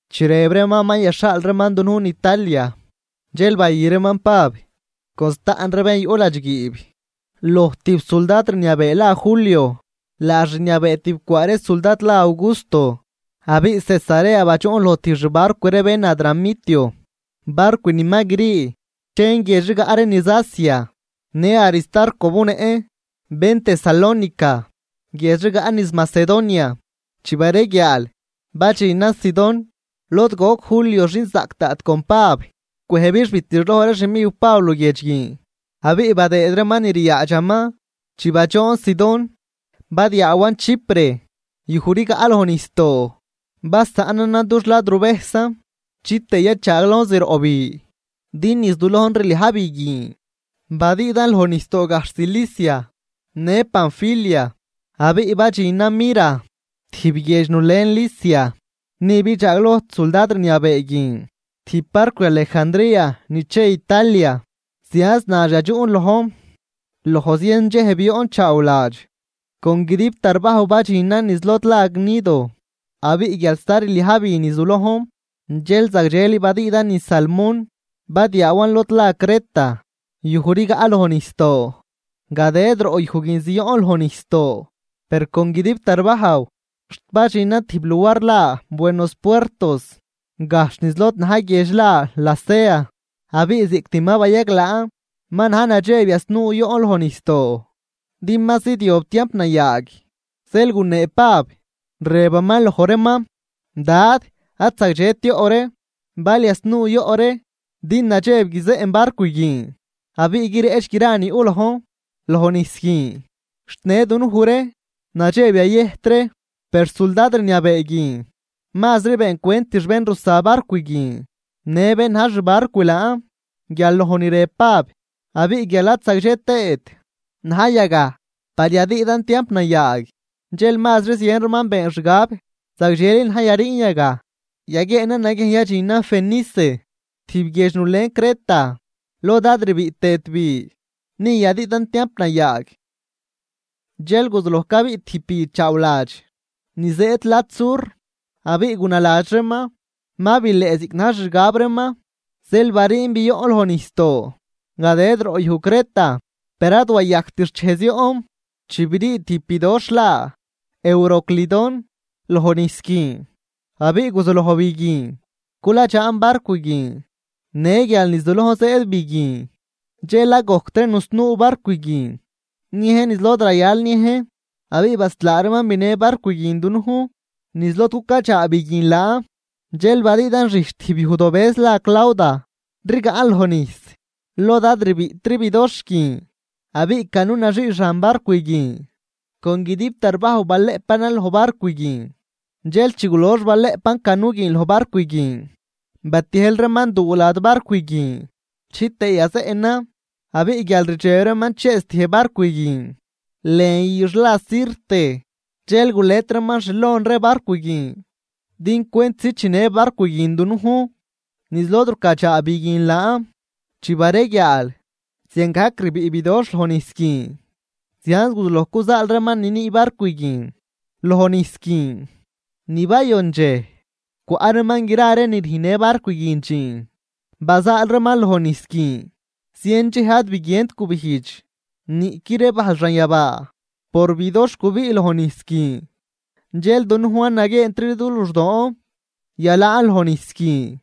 Chi rëb reeman ma yaxhaal reeman dunujn Italia, dxel bayü reeman Pab con staꞌn ree bén yuꞌ ladxguiib loj tijb suldad rniabee la Julio, laax rniabee tib cwaa ree suldad la Augusto. Abiꞌ Cesarea badxuꞌn loj tijb xbarcw ree bén Adramitio, barcw ni ma grii chen guiedx rigaꞌ ree niz Asia. Në Aristarco bunëꞌn, bén Tesalónica, guiedx rigaꞌ niz Macedonia. Chi bareguiaal, badxinan Sidón, lod goc Julio xinzaꞌc daꞌt con Pab, cwëjbix bitixloj ree xmiw Pab luguiedx guin abiꞌ badëëd reeman ni ryaadxaman. Chi badxoon Sidón badiaawan Chipre yuj rigaꞌ loj nijsdoo, basaꞌnanan dux ladruvejsan chitëë yachaaglojn zroꞌ bi, din niz du lojn rliaj bi guin. Badüüdan loj nijsdoo gajxh Cilicia në Panfilia abiꞌ badxinan Mira, tijb guiedx nulen Licia. Ni bidxaagloj suldad rniabee guin tijb barcw Alejandría ni che Italia, zianz nax yadxuꞌn lojn. Loj zien dxej bioꞌn chaawladx, con guidib tarbajw badxinan niz lod la Gnido. Abiꞌ guial sta rliaj bi niz du lojn, dxel zagdxeli badüüdan niz Salmón, badiaawan lod la Creta yuj rigaꞌ loj nijsdoo. Gadëd roꞌ yuj guin zioꞌn loj nijsdoo, per con guidib tarbajw, xt badxinan tijb luar la Buenos Puertos, gajxh niz lod na̱j guiedx la Lasea. Abiꞌ ziꞌct ma bayaglaan, ma na̱j nadxeb yasnuu yoꞌn loj nijsdoo, din ma zidyob tiamp nayaag. Zeel gunee Pab, rëbaman loj reeman: ―Dad, ad zagdxet yoꞌ ree bal yasnuu yoꞌ ree, din nadxeb guizeꞌn barcw guin abiꞌ guireꞌch gra ni yuꞌ lojn loj nijs guin, xt në dunuj ree nadxeb yayëjt ree. Per suldad rniabee guin mazri beencwentix bén rusa barcw guin në bén na̱j xbarcw laan, guial loj ni rëb Pab. Abiꞌ guial ad zagdxe tëët na̱j yagaj par yadüüdan tiamp nayaag, dxel mazri zien reeman been xgab zagdxeli na̱j yariin yagaj, yaguieenan naguiejn yadxinan Fenice, tijb guiedx nulen Creta lod ad rbiꞌ tëët bi, ni yadüüdan tiamp nayaag. Dxel guzuloj cabiꞌ tijb bi chaawladx ni zëëd lad sur, abiꞌ gunaladx reeman ma bileꞌ ziꞌc na̱j xixgab reeman, zeel bariin bioꞌn loj nijsdoo gadëd roꞌ yuj Creta. Per ad wayajct xchej zioꞌn chi birii tijb bidoxh la Euroclidón loj nijs guin. Abiꞌ guzuloj bi guin culadxaan barcw guin. Në guial niz du lojn zëëd bi guin dxel ad gojctri nusnuu barcw guin niejn niz lod rayal niejn, abiꞌ baslaa reeman binë barcw guin dunujn niz lod cucadxaa bi guin laan. Dxel badüüdan xijch tijb yujdobëz la Clauda rigaꞌn loj nijs, lod ad rbiꞌtri bidoxh guin, abiꞌ canu naxii xan barcw guin con guidib tarbajw balëꞌpanan loj barcw guin. Dxel chi gulox balëꞌpan canu guin loj barcw guin, batiejl reeman duu lad barcw guin chitëë yazeꞌnan. Abiꞌ guial rdxeb reeman chëëztiej barcw guin lën üx la Sirte, dxel gulet reeman xlon ree barcw guin din cwentzi chinë barcw guin dunujn niz lod rucadxaa bi guin laan. Chi bareguiaal, ziangajc rbiꞌ bidoxh loj nijs guin, zianz guzuloj cuzaal reeman ni nüü barcw guin loj nijs guin. Ni bayon dxej, cwaꞌ reeman gra ree ni rüjnnë barcw guin dxiin bazaal reeman loj nijs guin. Zien dxej ad biguient gubijdx niꞌqui ree bajl xanyabaa por bidoxh gubiꞌ loj nijs guin, dxel dunujn ad naguieentri du luxdoon yalaan loj nijs guin.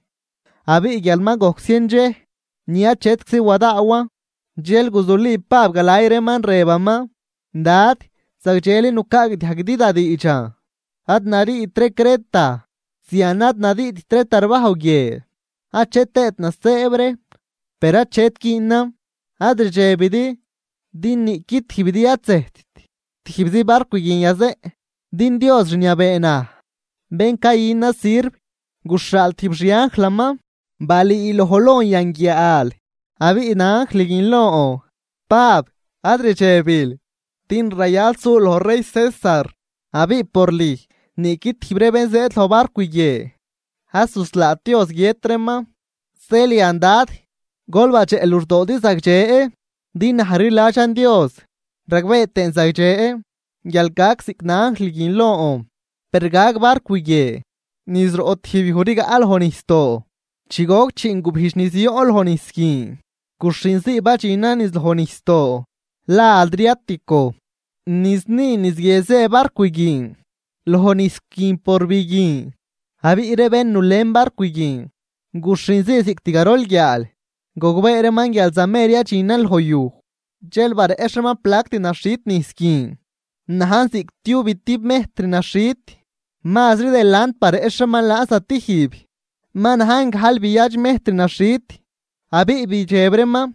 Abiꞌ guial ma gojc zien dxej ni achetczi wadaawan, dxel guzuli Pab galay reeman, rëbaman: ―Dad, zagdxeli nucaagdiajguidi da diidxan ad nariit ree Creta, zian ad nadüüdt ree tarbajw guie achet tëët nasëëb ree. Per achet güünan, ad rdxebidi din niꞌqui tijbidi ad zëjtt, tijbzi barcw guin yazeꞌn. Din Dios rniabee naj, bén cayünan sirv guxhaal tijb xi anjlaman balüüloj lon yan guiaal. Abiꞌ na anjl guin lon: “Pab, ad rdxebil, din rayal sul loj rey César, abiꞌ por lüj niꞌqui tijb ree bén zëëd loj barcw guie ad zuslaat Dios guiët reeman.” Zeel yan dad, gol badxeꞌ luxdoodi zagdxe, din naj rliladxan Dios, ragbee tëën zagdxe guial gac ziꞌc na anjl guin lon. Per gag barcw guie niz roꞌ tijb yuj rigaꞌ loj nijsdoo. Chi goc chiin gubijdx ni zioꞌn loj nijs guin, guxhinzii badxinan niz loj nijsdoo la Adriatico, niz ni niz guie zë barcw guin loj nijs guin por bi guin. Abiꞌ ree bén nulen barcw guin, guxhinzii ziꞌct garol guiaal gogbee reeman guial zamer yadxinan loj yuj. Dxel bareꞌxh reeman plact naxhit nijs guin, najn ziꞌctiubitib mejtr naxhit. Mazri delant bareꞌxh reeman laan zatijb ma najn gajlbiadx mejtr naxhit. Abiꞌ bidxeb reeman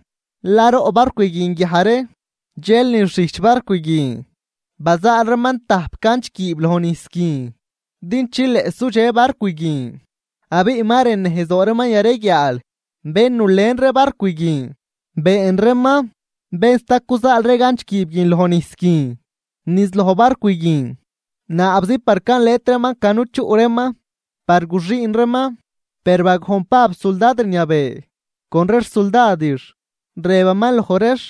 laroꞌ barcw guin guiaj ree, dxel niz xijch barcw guin bazaal reeman tajp ganch guiib loj nijs guin din chileꞌ sudxe barcw guin, abiꞌ ma rën nejzdoo reeman yareguiaal. Bén nulen ree barcw guin, been reeman bén sta cuzaal ree ganch guiib guin loj nijs guin niz loj barcw guin, naabzi par calet reeman canu chuꞌ reeman par guxüün reeman. Per bagojn Pab suldad rniabee con ree xsuldadix, rëbaman loj reex: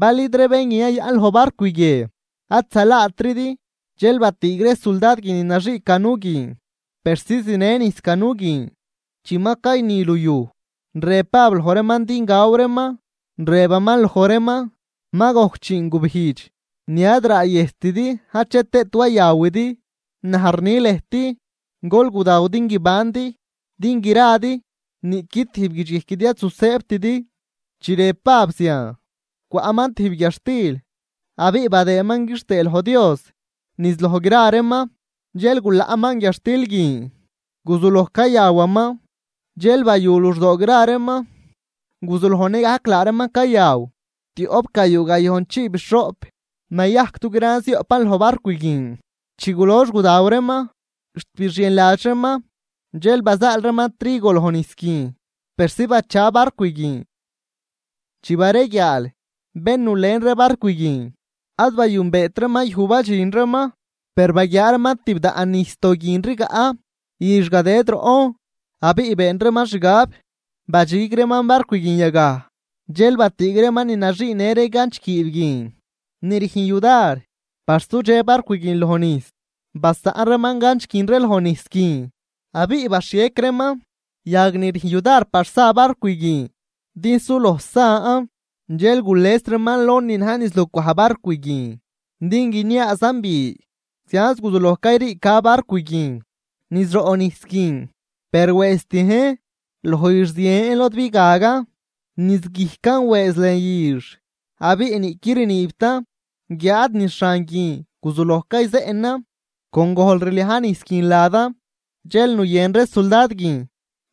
―Bal id ree bén guin yayaꞌn loj barcw guie, ad zalaatridi. Dxel batüüg ree suldad guin ni naxii canu guin persi zinë nijs canu guin. Chi ma cayni luyuj, rëb Pab loj reeman din gaw reeman, rëbaman loj reeman: ―Ma gojc chiin gubijdx ni ad raayëjstidi achet tëët wayawidi. Naj rni lëjt, gol gudaw din guibandi, din gradi niꞌqui tijb guidxguijquidi ad zusëëbtidi. Chi rëb Pab zian, cwaꞌman tijb guiadxtil, abiꞌ badëëman quixtëë loj Dios niz loj gra reeman, dxel gulaꞌman guiadxtil guin guzuloj cayawaman. Dxel bayu luxdoo gra reeman, guzuloj nëgajc laa reeman cayaw. Tioꞌpgayuu gayojnchiibixhoꞌp nayajc dugran zioꞌpan loj barcw guin. Chi gulox gudaw reeman xt bixienladx reeman, dxel bazaal reeman trigo loj nijs guin persi bacha barcw guin. Chi bareguiaal, bén nulen ree barcw guin, ad bayünbeet reeman yuj badxin reeman. Per baguiaa reeman tibdaꞌn nijsdoo guin rigaꞌ üx gadëëd roꞌn, abiꞌ been reeman xgab badxig reeman barcw guin yagaj. Dxel batüüg reeman ni naxiinë ree ganch guiib guin ni rüjn yudar par sudxe barcw guin loj nijs, basaꞌn reeman ganch guin ree loj nijs guin, abiꞌ baxhiec reeman yag ni rüjn yudar par sa barcw guin din suloj san. Dxel gules reeman lon ni na̱j niz lucwaj barcw guin din guiniaazan bi, zianz guzuloj cayriica barcw guin niz roꞌ nijs guin. Per wëëztiejn loj üx zien lod bigagan. Niz guijcan wëëz lën üx abiꞌ niꞌquid rniibtan, guiáad niz xan guin guzuloj cayzeꞌnan con gojl rliaj nijs guin ladan. Dxel nuyën ree suldad guin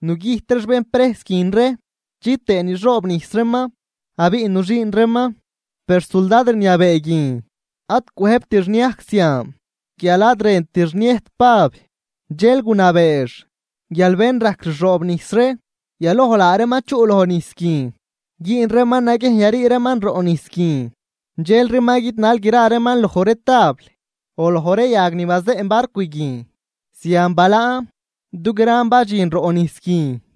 nugüjt reex bén prejs guin ree, chitëë nixoobnijs reeman abiꞌ nuxüün reeman. Per suldad rniabee guin ad cwëjbtix niajc zian guial ad rëntix niëjt Pab, dxel gunabeex guial bén rajc rxoobnijs ree, yaloj laa reeman chuꞌ loj nijs guin güün reeman naguiejn yarii reeman roꞌ nijs guin. Dxelri ma guidnal gra reeman loj ree tabl o loj ree yag ni bazeꞌn barcw guin. Zian balaan, dugran badxin roꞌ nijs guin.